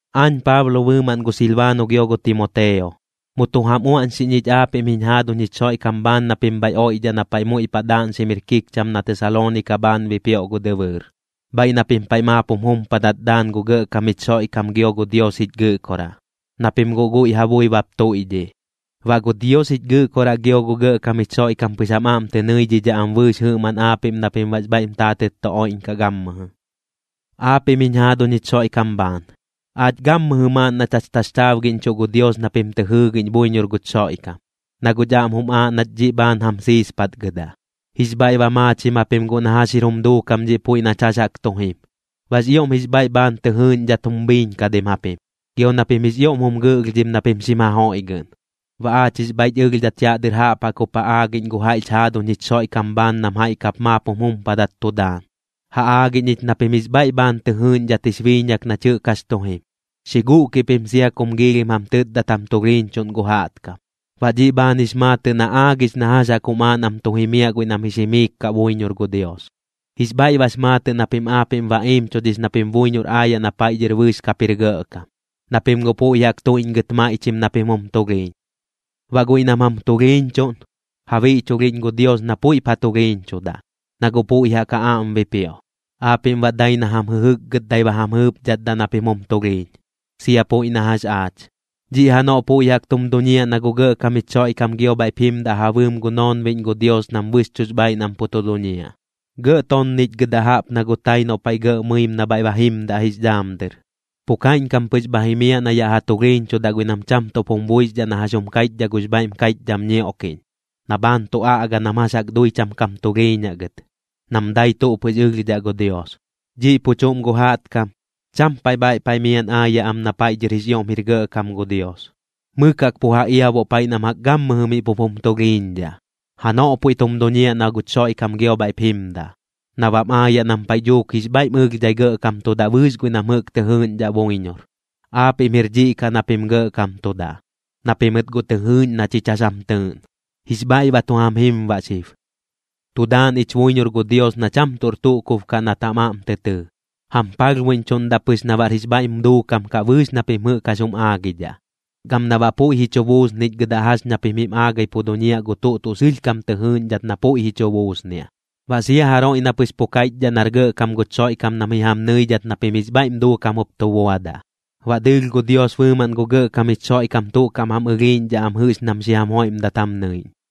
Aañ Paablo bɨɨmaꞌn gu Silbaano gio gu Timoteo, mu tu jam uaꞌñxiꞌñ ich aapiꞌm jiñ jaaduñ jich Xoiꞌkam bhaan na pim bhaiꞌ oiꞌdhaꞌ na paiꞌ muiꞌ paꞌ daaꞌñxim jir kikcham na Tesaloonika bhaan bipioꞌ gu dɨbɨɨr, bhaiꞌ na pim paiꞌ maap jum jumpadat daan gu Gɇꞌkam jich Xoiꞌkam gio gu Dios jich Gɨꞌkoraꞌ, na pim guꞌ guiꞌ ja bui bap tuiꞌdhiꞌ. Baꞌ gu Dios jich Gɨꞌkoraꞌ gio gu Gɇꞌkam jich Xoiꞌkam pɨx jam aꞌm tɨ nɨidhidhaꞌ am bɨɨx jɨꞌmaꞌn aapiꞌm na pim baꞌx bhaiꞌm taatɨt tu oiꞌñkaꞌ gammɨjɨ. Aapiꞌm jiñ jaaduñ jich Xoiꞌkam bhaan, aach gammɨjɨ maaꞌn nach jax taxchaabgiꞌñchuꞌ gu Dios na pim tɨ jɨɨgiꞌñ buiñor guch Xoiꞌkam, na guꞌch aꞌm jum aaꞌ nach dhiꞌ bhaan jam siispatgɨdaꞌ. Jix bhaiꞌ ba maachim japim guꞌ na jax jir jum duukam dhiꞌ puiꞌ nach jax jaꞌk tu jim, baꞌx ioꞌm jix bhaiꞌ bhaan tɨ jɨɨꞌñdhidhat jum biiñkadim japim, gio na pim jix ioꞌm jum gɨꞌlhdhim na pim xim jajoiꞌgɨꞌn. Baꞌ aach jix bhaiꞌch ɨlhdhat yaꞌ dɨr jaꞌp jaꞌk jup ja aagiꞌñ gu jaiꞌch jaaduñ jich Xoiꞌkam bhaan nam jaiꞌ kap maap jum jumpadat tu daan. Ja aagiꞌñ ich na pim jix bhaiꞌ bhaan tɨ jɨɨꞌñdhat jix biiñak nach jɨꞌk jax tu jim, xi guꞌkiꞌ pim sia kum giilhim jam tɨtdat jam tulhiiñchuꞌn gu jaꞌtkam. Baꞌ dhiꞌ bhaan jix maatɨꞌ na aagix na jax jaꞌk jum aaꞌ nam tu jimiaꞌ guiꞌ nam jix jimiik kaꞌ buiñor gu Dios. Jix bhaiꞌ bax maatɨꞌ na pim aapiꞌm ba iimchudhix na pim buiñor aayaꞌ na paiꞌ dhɨr bɨɨx kap jir gɇꞌkam, na pim guꞌ puiꞌ jaꞌk tuiꞌñgɨt maiꞌchim na pim jum tulhiiñ. Baꞌ guiꞌ nam jam tulhiiñchuꞌn, ja biꞌchulhiꞌñ gu Dios na puiꞌp ja tulhiiñchudaꞌ, na guꞌ puiꞌ jaꞌk ja aꞌm bipioꞌ. Aapiꞌm baꞌ dai na jam jɨjɨkgɨtdai ba jam jɨɨpdhatdaꞌ na pim jum tulhiiñ, sia puiꞌ na jax aach. Dhiꞌ janoꞌ puiꞌ jaꞌk tum duñiaꞌ na gu Gɇꞌkam jich Xoiꞌkam gio bhaiꞌp jimdaꞌ ja bɨɨm gu noonbiꞌñ gu Dios nam bɨxchuꞌx bhaaiꞌ nam pu tu duñiaꞌ, gɇꞌ tonnichgɨdaꞌ jaꞌp na gu tai noꞌ paiꞌ gɇꞌ mɨim na bhaiꞌ ba jimdaꞌ jix dhaam dɨr. Pu kaiꞌñkam pɨx bha jimiaꞌ na yaꞌ ja tulhiiñchudaꞌ guiꞌ nam cham tuꞌp jum buixdhaꞌ na jax jum kaiꞌchdhaꞌ gux bhaiꞌm kaiꞌchdham ñioꞌkiꞌñ, na bhaan tu aꞌga nam jax jaꞌk dui cham kam tulhiiñaꞌ gɨt, nam dai tuꞌ pɨx ɨlhdhaꞌ gu Dios. Dhiꞌ pu chuꞌm gu jaꞌtkam, cham paiꞌ bhaiꞌ paiꞌ miaꞌn aayaꞌ am na paiꞌ dhɨr jix ioꞌm jir gɇꞌkam gu Dios, mɨk jaꞌk pu ja iabuꞌ paiꞌ nam jaꞌk gammɨjɨ miꞌ pup jum tulhiiñdhaꞌ. Janoꞌ puiꞌ tum duñiaꞌ na guch Xoiꞌkam gio bhaiꞌp jimdaꞌ, na bam aayaꞌ nam paiꞌ dhuuk jix bhaiꞌm ɨlhdhai gɇꞌkamtudaꞌ bɨɨx guiꞌ nam jɨꞌk tɨ jɨɨꞌñdhaꞌ buiñor. Aapiꞌm jir dhiꞌ kaꞌ na pim gɇꞌkamtudaꞌ, na pimɨt guꞌ tɨ jɨɨꞌñ na chich jax jam tɨɨꞌn, jix bhaiꞌ ba tu jam jim baꞌ xib. Tu daan ich buiñor gu Dios na cham tuꞌr tuꞌ kub kaꞌ nat jam aꞌm tɨ tɨɨ. Jam palhbuiꞌñchuꞌndaꞌ pɨx na baꞌr jix bhaiꞌm duukam kaꞌ bɨɨx na pim jɨꞌk jax jum aagidhaꞌ, gam na baꞌ puiꞌ ji chu buusnichgɨdaꞌ jax ña pim jim aagai pu duñiaꞌ gu tuꞌ tuꞌ sɨlhkam tɨ jɨɨꞌñdhat na puiꞌ ji chu buusniaꞌ. Baꞌ sia jaroiꞌ na pɨx pu kaiꞌchdhaꞌ nar gɇꞌkam guch Xoiꞌkam nam ji jam nɨidhat na pim jix bhaiꞌm duukam jup tu buadaꞌ. Baꞌ dɨɨlh gu Dios bɨɨmaꞌn gu Gɇꞌkam jich Xoiꞌkam tuꞌ kaꞌm jam ɨlhiiꞌñdhaꞌ am jɨꞌx nam xi jam joiꞌmdat jam nɨiꞌñ.